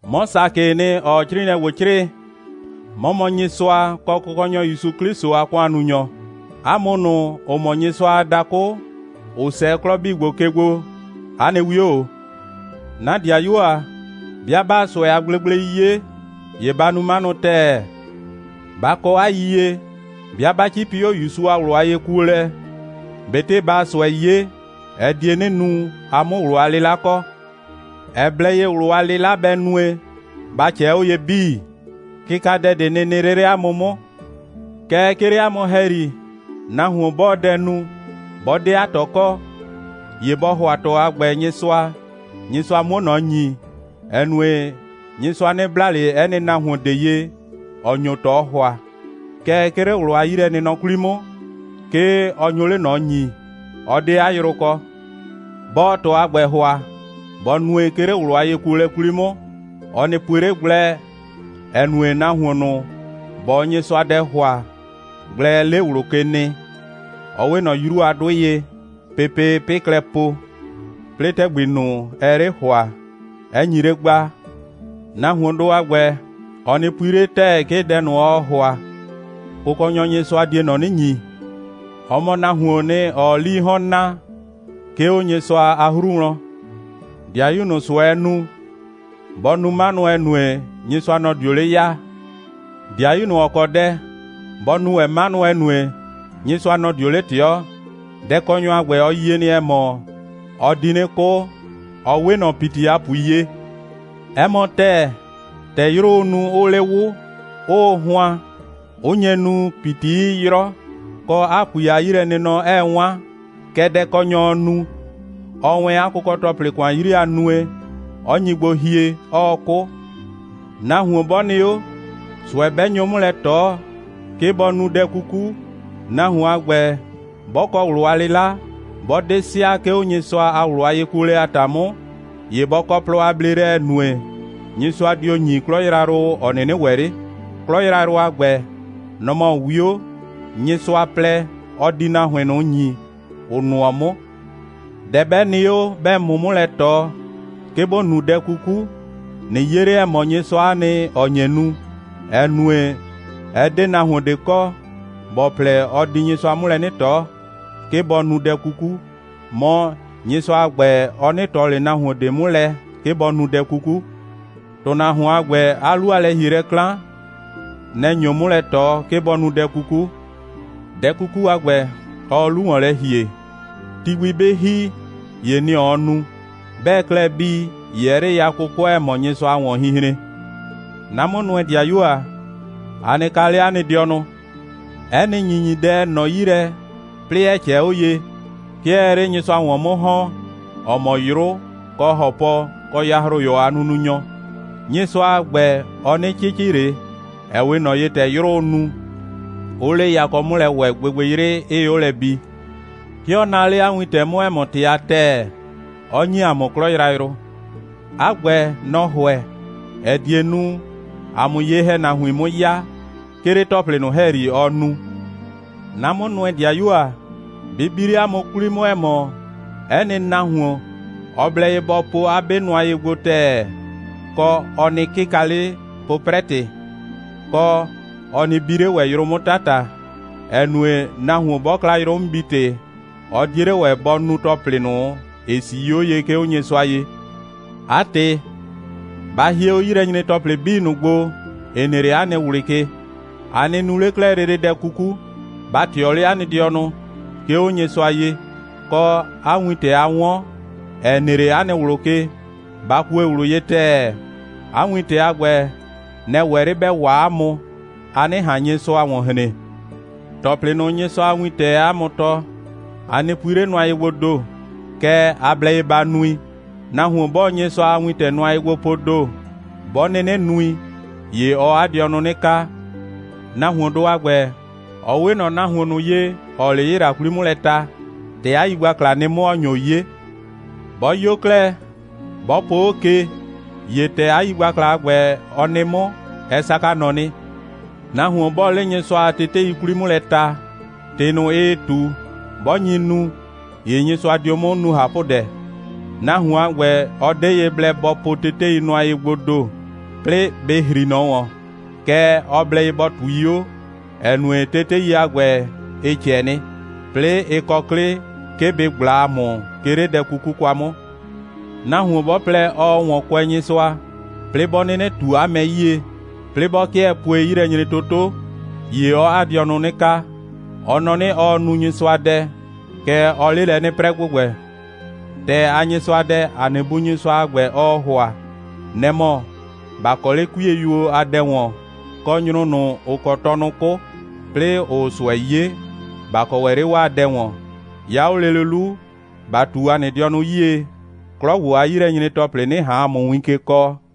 'Mɔ Sakɩɩ nɩ, ‑ɔɔ 'crɩɩnɩɛ ‑gbo 'crɩɩ. 'Mɔ mɔ Nyɩsʋa kɔ Kʋkɔnyɔ ‑Yusu 'Klɩsʋ a ‑kʋannunyɔ. 'A mʋ ꞊nʋ, ‑ʋ mɔ Nyɩsʋa a dakʋ, ‑ʋ 'sɛɛ 'klɔ 'bii ‑gbo ke gbo, 'a nɩ 'wio ‑o. 'Na ‑dɩayuo ‑a, 'bɩa 'baa ꞊sʋɛ a gblegblei 'ye, ‑ye ba nu 'manʋ ‑tɛɛ. Ba kɔ 'a yiyie, 'bɩa 'ba 'cipi 'o ‑Yusu a ꞊wlʋ a yekuolɛ, ꞊betɩ baa ꞊sʋɛ 'ye, ɛ die 'nɩ nu, a 'mʋ ꞊wlʋ a 'lɩla kɔ. Ɛ blɛ ye, ꞊wlʋ a 'lɩla bɛ nue, ba ꞊cɛɛ 'o ye 'bii, kɩkadɛ ꞊de nɩ nɩ 'le 'le 'a mʋ 'mʋ. Kɛɛ, 'ke 'le 'a mʋ ‑hɛyri, nahuon 'bɔɔ dɛ nu, 'bɔ 'de 'a ꞊tɔ kɔ, ‑ye bɔ ‑hʋa ꞊tɔ a ‑gbɛ Nyɩsʋa, Nyɩsʋa 'muo ꞊nɔ ‑nyi, ‑ɛ nue, Nyɩsʋa 'nɩ bla ꞊le 'ɛ nɩ nahuon ꞊de ye, ‑ɔ nyo ꞊tɔ ‑hʋa. Kɛɛ, 'ke 'le ꞊wlʋ a 'yilɛnɩnɔ 'kwli 'mʋ, 'ke ɔ nyo 'le ꞊nɔ ‑nyii. Ɔ 'de 'a yrʋ kɔ. 'Bɔɔ ꞊tɔ a ‑gbɛ ‑hʋa, bɔ nue, 'ke 'le ꞊wlʋ a yekuolɛ 'kwli 'mʋ. Ɔ nɩ pue 'le gblɛ, ‑ɛ nue, nahuon ꞊nʋ, ‑bɔɔ Nyɩsʋa dɛ ‑hʋa, gblɛɛ 'le ꞊wlʋ ke nɩ, ɔ 'we ꞊nɔ 'yru a 'dʋɩ ye, pepee 'pɩ klɛ po, 'plɩɩ ‑tɛgbi ꞊nʋ, ɛɛ 'le ‑hʋa, 'ɛ nyi 'le gbaa. Nahuondʋ a ‑gbɛ, ɔ nɩ pui 'le ‑tɛɛ, 'ke dɛ ꞊nʋ, ɔɔ ‑hʋa, Kʋkɔnyɔ Nyɩsʋa die ꞊nɔ 'nɩ ‑nyi. Ɔ mɔ nahuoon nɩ, ‑ɔɔ 'lii 'hɔn naa, 'ke 'o Nyɩsʋa a 'hru wlɔn. ‑Dɩayu ꞊nʋ, ꞊sʋɛɛ nu, bɔ nu 'manʋ, ‑ɛ nue, Nyɩsʋa, nɔ‑ dio 'le 'yaa. ‑Dɩayu ꞊nʋ, ‑ɔ kɔ dɛ, bɔ nu ‑wɛ 'manʋ, ‑ɛ nue, Nyɩsʋa, nɔ‑ dio 'le ꞊tɩɔ. Dɛkɔnyɔ a ‑gbɛ, ɔ yie nɩ, ‑ɛ mɔ, ɔ di 'nɩ 'kʋ, ɔ 'we ꞊nɔ ‑piti a ‑pui ye. 'Ɛ mɔ ‑tɛɛ, ‑tɛ 'yrʋʋ nu, 'ʋʋ 'le 'wʋ, 'ʋʋ hʋan, 'ʋ nye nu, ‑piti 'ɩɩ 'yrɔ, kɔ, 'a ‑pui a 'yilɛnɩnɔ 'ɛɛ 'wan, kɛ dɛkɔnyɔɔ nu, ɔɔ wɛn 'a kʋkɔ‑tɔplɩ ‑kʋan 'yri a nue, 'ɔ nyi gbo hie, 'ɔɔ 'kʋ. Nahuon 'bɔ nɩ 'o, ꞊sʋɛ 'bɛ nyo 'mʋ lɛ ꞊tɔ, 'ke bɔ nu dɛ 'kuku, nahuon a ‑gbɛ, 'bɔ kɔ ꞊wlʋ a 'lɩla, 'bɔ 'de sɩa, 'ke 'o Nyɩsʋa a ꞊wlʋ a yekuolɛ a ‑ta 'mʋ, ‑ye bɔ kɔ plɔ a bleelɛ, ‑ɛ nue, Nyɩsʋa dio ‑nyi 'klɔ yrayrʋ, ‑ɔ 'nɩnɩ ‑wɛ 'le. 'Klɔ yrayrʋ a ‑gbɛ, nɔ‑ mɔ 'wio, Nyɩsʋa plɛ, ɔ di nahuin ꞊nʋ ‑nyi, ‑ʋ nʋɔ 'mʋ. Dɛ 'bɛ nɩ 'o, 'bɛɛ ‑mʋ 'mʋ lɛ ꞊tɔ, 'ke ‑bo nu dɛ 'kuku, ꞊nɩ 'ye 'le, ‑ɛ mɔ, Nyɩsʋa'a nɩ, ‑ɔ nye nu, ‑ɛ nue, ɛ 'de nahuon ꞊de kɔ, ‑bɔ plɛ, ɔ di Nyɩsʋa 'mʋ lɛ 'nɩ ꞊tɔ, 'ke bɔ nu dɛ 'kuku, mɔ, Nyɩsʋa a ‑gbɛ, ɔ 'nɩ ꞊tɔ ꞊le nahuon ꞊de 'mʋ lɛ, 'ke bɔ nu dɛ 'kuku. ‑Tʋnahuon a ‑gbɛ, 'a 'lu a lɛ‑hielɛ 'klan, nɛ‑ nyo 'mʋ lɛ ꞊tɔ, 'ke bɔ nu dɛ 'kuku. Dɛ 'kuku a ‑gbɛ, ɔɔ 'lu ‑wɔn lɛ ‑hie, ti gbi 'bɩ ‑hi, ‑ye nɩ‑ ɔɔ nu. 'Bɛɛ klɛ bii, ‑ye ɛɛ 'le ya 'kʋkʋɛ, ‑ɛ mɔ Nyɩsʋa a ‑wɔnhinhren. 'Na 'mʋnʋɛ‑dɩayuo ‑a, a nɩ kaa 'le 'a nɩ dɩɔnʋ! 'Ɛ nɩ ‑nyinyidɛ, ‑ɛ nɔ 'yi lɛ, 'plɩɩ ‑ɛ ꞊cɛɛ 'o ye, 'ke ɛɛ 'le Nyɩsʋa ‑wɔn 'mʋ ‑hɔn, ‑ɔ mɔ 'yrʋ kɔ ‑hɔpɔ kɔ yahroyɔ a nununyɔ. Nyɩsʋa a ‑gbɛ, ɔ 'nɩ 'cɩcɩ ꞊le, ‑ɛ 'we ꞊nɔ ye, ‑tɛ 'yrʋʋ nu, 'ʋʋ 'le yakɔ 'mʋ lɛ ‑wɛ, gbɩgbɩyrɩ 'ɩɩ 'o lɛ bi. 'Ke ɔ naa 'le 'a wintɛ 'mʋ, ‑ɛ mɔ ‑tɩ a ‑tɛɛ, 'ɔ ‑nyi ‑a mʋ 'klɔ yrayrʋ. 'A ‑gbɛ, nɔ‑ ‑hʋɛ, ‑ɛ die nu, ‑a 'mʋ ye‑hɛnahuin ꞊nʋ 'mʋ 'ya, 'ke 'le ‑tɔplɩ ꞊nʋ ‑hɛyri, ɔ nu. 'Na 'mʋnʋɛ‑dɩayuo ‑a, bɩ bi 'le 'a mʋ 'kwli 'mʋ, ‑ɛ mɔ, 'ɛ nɩ nahuon, ɔ blɛ ye bɔ po 'a 'be nʋa ye gbo ‑tɛɛ, kɔ, ɔ nɩ 'kɩka 'le 'pʋprɛ‑tɩ, kɔ, ɔ nɩ bi 'le ‑wɛ 'yrʋ 'mʋ 'tata, ‑ɛ nue, nahuon 'bɔ kla 'yrʋ'mʋbi‑tɩ, ɔ 'die 'le ‑wɛ bɔ nu ‑tɔplɩ ꞊nʋ, ‑ɩ 'sii 'o ye, 'ke 'o Nyɩsʋa ye. 'A ‑tɩ, ba hie 'o 'yilɛnyre‑tɔplɩ 'bii ꞊nʋ gbo, ‑ɩ nɩ 'le 'a nɩ ꞊wlɩ ke. A nɩ nu 'le 'klɛɛ lele dɛ 'kuku. Ba ꞊tɩɔ 'le 'a nɩ dɩɔnʋ, 'ke 'o Nyɩsʋa ye, kɔ, 'a wintɛ, a 'wɔn, ‑ɛ nɩ 'le 'a nɩ ꞊wlʋ ke, ba kue ꞊wlʋ ye ‑tɛɛ. 'A wintɛ a ‑gbɛ, nɛ‑ ‑wɛ 'le ‑bɛ waa 'a mʋ, a 'nɩ ꞊han Nyɩsʋa ‑wɔn hren. ‑Tɔplɩ ꞊nʋ, Nyɩsʋa a wintɛɛ 'a mʋ tɔɔ, a nɩ pui 'le nʋa ye gboo ‑do, kɛɛ, a blɛ ye ba nui. Nahuon 'bɔɔ Nyɩsʋa a wintɛ nʋa ye gbo poo ‑do, 'bɔ 'nɩnɩ nui, ‑ye ɔɔ 'a dɩɔnʋ 'nɩ kaa. Nahuondʋ a ‑gbɛ, ɔ 'we ꞊nɔ nahuon ꞊nʋ ye, ‑ɔɔ 'le 'yɩla 'kwli 'mʋ lɛ ta, ‑tɛ 'a yigbakla nɩ 'mʋ, ‑ɔ nyo 'ye. 'Bɔ 'yo 'klɛɛ, 'bɔ po 'o ke, ‑ye ‑tɛ 'a yigbakla a ‑gbɛ, ɔ nɩ 'mʋ, ɛ saka ꞊nɔ nɩ. Nahuon 'bɔɔ 'le Nyɩsʋa a tetei 'kwli 'mʋ lɛ ta, ‑tɩ ꞊nʋ, ɩɩ ꞊tu, 'bɔ nyi nu, ‑ye Nyɩsʋa dio 'mʋ nu ꞊hapʋdɛ. Nahuon a ‑gbɛ, ɔ 'de ye blɛ bɔ po tetei nʋa ye gboo ‑do, 'plɩɩ bɩ ‑hri ꞊nɔ ‑wɔn, kɛɛ, ɔ blɛ ye bɔ ꞊tui 'o, ‑ɛ nue, tetei a ‑gbɛ, ɩ ꞊cɛ nɩ, 'plɩɩ 'ɩ kɔ 'klɩ, 'ke bɩ ꞊gbla ‑a mʋ, 'ke 'le dɛ 'kuku kwa 'mʋ. Nahuon 'bɔ plɛ, ɔɔ ‑wɔn kʋɛ Nyɩsʋa, 'plɩɩ 'bɔ 'nɩnɩ ꞊tu 'a mɛ 'yie, 'plɩɩ 'bɔ 'kɩɛ pue 'yilɛnyretoto, ‑ye ɔɔ 'a dɩɔnʋ 'nɩ kaa. Ɔ nɔ 'nɩ, ɔɔ nu Nyɩsʋadɛ, kɛɛ, ɔɔ 'le lɛ 'nɩ 'prɛ ‑gbʋgbɛ. ‑Tɛɛ a Nyɩsʋadɛ, ‑a nɩ Bu Nyɩsʋa a ‑gbɛ, ɔɔ ‑hʋa, nɛ‑ mɔ: ‑Ba kɔ 'le 'kuiyeyuo a dɛ ‑wɔn, kɔ, nyrʋ ꞊nʋ, ‑ʋ kɔ tɔnʋ 'kʋ, 'plɩɩ ‑ʋʋ ꞊sʋɛ 'ye, ‑ba kɔ ‑wɛ 'le 'waa dɛ ‑wɔn. 'Ya 'o lele 'lu, ‑ba ꞊tu ‑a dɩɔnʋ 'yie, 'klɔ ‑gbo a 'yilɛnyre‑tɔplɩ 'nɩ ꞊han ‑a mʋ win ke kɔɔ.